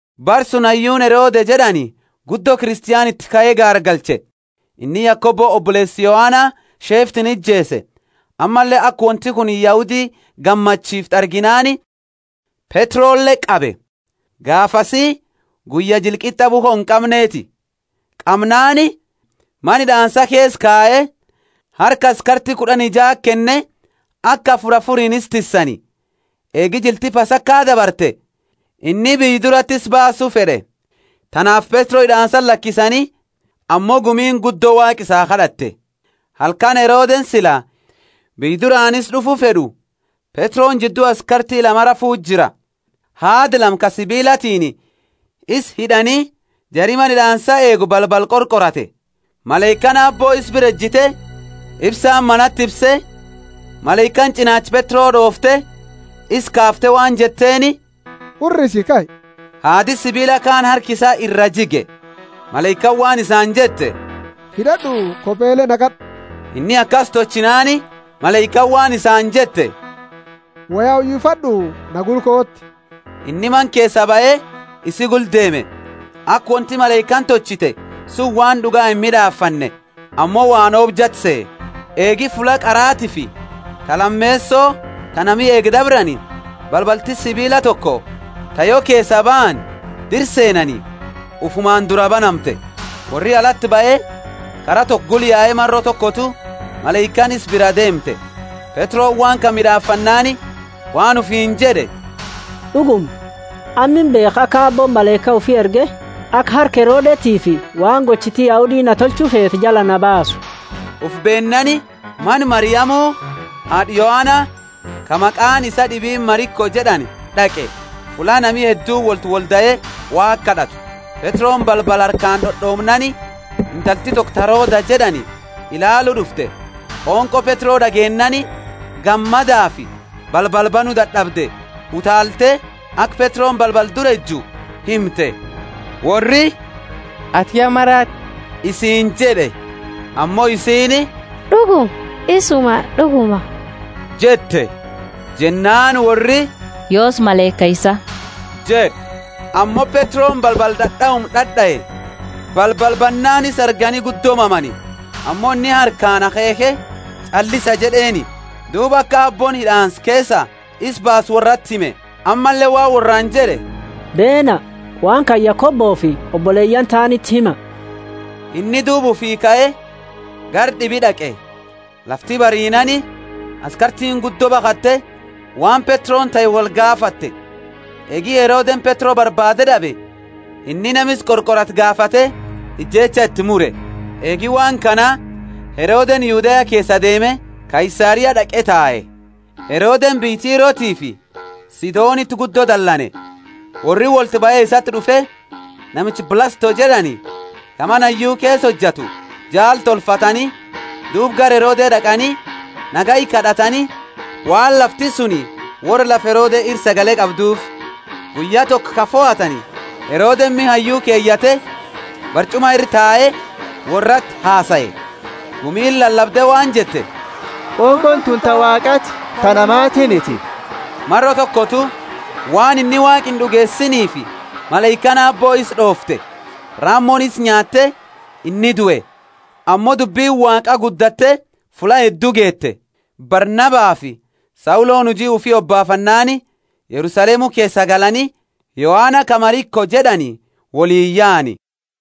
Bara suni hayyuuni Herode jed'ani gumi Kristo iti kae gaargalche. Inni Yakobo oboleesa Yohana sheeftiini ijeese. Ammalle aka wonti kunini Yahudi gammachiiftu arginaani Petrole qabe. (Gaafasi guyya jila qit'a bukho inqamneti.) Qamnaani mana hid'aansa keesa kaye, harka askarti kud'ani jaati kenne, aka afuri afuriini isa tissani. Eegi jilti Pasaka dabarte, inni biyya durati isa baasu fed'e. Tanaafi Petro hid'aansati lakisani, ammo gumiini guddo Waaqa isaa kad'atte. Halkani Herodeni sila biyya duraani isa d'ufu fed'u, Petroni jiddu askarti lama rafu jira. Haada lama ka sibiilatiini isa hid'ani, jari mana hid'aansa eegu balbala qorqorate. Malaikaani Aabbo isa bira ejite, ifsaani manati ifse, malaikaani ch'inaacha Petro d'oofte, isa kaafte waan jetteeni, Hurrisi kai! Haadi sibiila kaani harka isaa iraa jige. Malaikaani waan isaani jette, Hid'ad'u, kopele naqad'u. Inni akasi tolchinaani malaikaani waan isaani jette, Woya uyifad'u, na gula kooti. Inni mana keesaa bahe isi gula deeme, aka wonti malaikaani tolchite sunini waan d'uga imid'aafanne, ammo waan oobjate sehe. Eegi fulla qaraatifi ta lameeso ta nami eegu dabrani, balbalti sibiila toko ta yo keesa baani dira seenani ufumaani duraa banamte. Worri alati bahe, kara toko gula yae maro tokotu malaikaani isa bira deemte. Petroni waan kana mid'aafannaani waan ufiini jed'e, D'uguma, amma imbeekha aka Aabbooni malaika ufi erge, aka harka Herodetiifi waan gochiti Yahudi na tolchu feete jalaa na baasu. Ufi beennaani, mana Mariamu, haad'a Yohana, ka maqaani isaa d'ibiini Mariko jed'ani d'aqe, fulla nami hedduuni wolti woldae Waaqa kad'atu. Petroni balbala harkaani d'od'oomnaani, intalti toko ta Roda jed'ani ilaalu d'ufte. Qonqo Petro d'ageennaani, gammadafi balbala banu dad'abde, utaalte, aka Petroni balbala dura eju himte. Worri, Ati ya maraate isiini jed'e. Ammo isiini D'uguma, isuma d'uguma jette. Jennaani worri, Yoosi malaika isaa jed'e. Ammo Petroni balbala d'ad'auma d'ad'ae. Balbala bannaani isa argani guddo mamani. Ammo inni harkaani akheekhe, Ch'allisa jed'eeni; duuba aka Aabbooni hid'aansa keesaa isa baase worrati hime. Ammalle waan worraani jed'e, Beena, waan kana Yakobofi oboleyaani taaniti hima. Inni duuba ufi kae gara d'ibi d'aqe. Lafti bariinaani askartiini guddo bakhatte, waan Petroni tahe wolgaafatte. Eegi Herodeni Petro barbaade d'abe inni nama isa qorqorate gaafate ijeecha iti mure. Eegi waan kana Herodeni Yudea keesaa deeme Kaisaria d'aqe tae. Herodeni biyya Tirofi Sidoniti guddo dalane. Worri wolti bahe isati d'ufe, namicha Blasto jed'ani, ka mana hayyu keesa hojatu jaala tolfatani, duuba gara Herode d'aqani, nagaya kad'atani, waan lafti suni worra lafa Herode ira sagale argatuufi. Guyya toko ka fohatani, Herodeni miha hayyu keyate, barch'uma ira tae, worrati hasae. Gumiini lalabde waan jette, Qonqooni tuni ta Waaqati, ta namatiiniti. Maro tokotu waan inni Waaqa ind'ugeesinifi malaikaani Aabbo isa d'oofte. Ramoni isa nyaate, inni due. Ammo dubbini Waaqa guddatte fulla heddu geete. Barnabafi Sauloni huji ufi hobaafannaani Yerusalemu keesaa galani, Yohana ka Mariko jed'ani woliini yaani.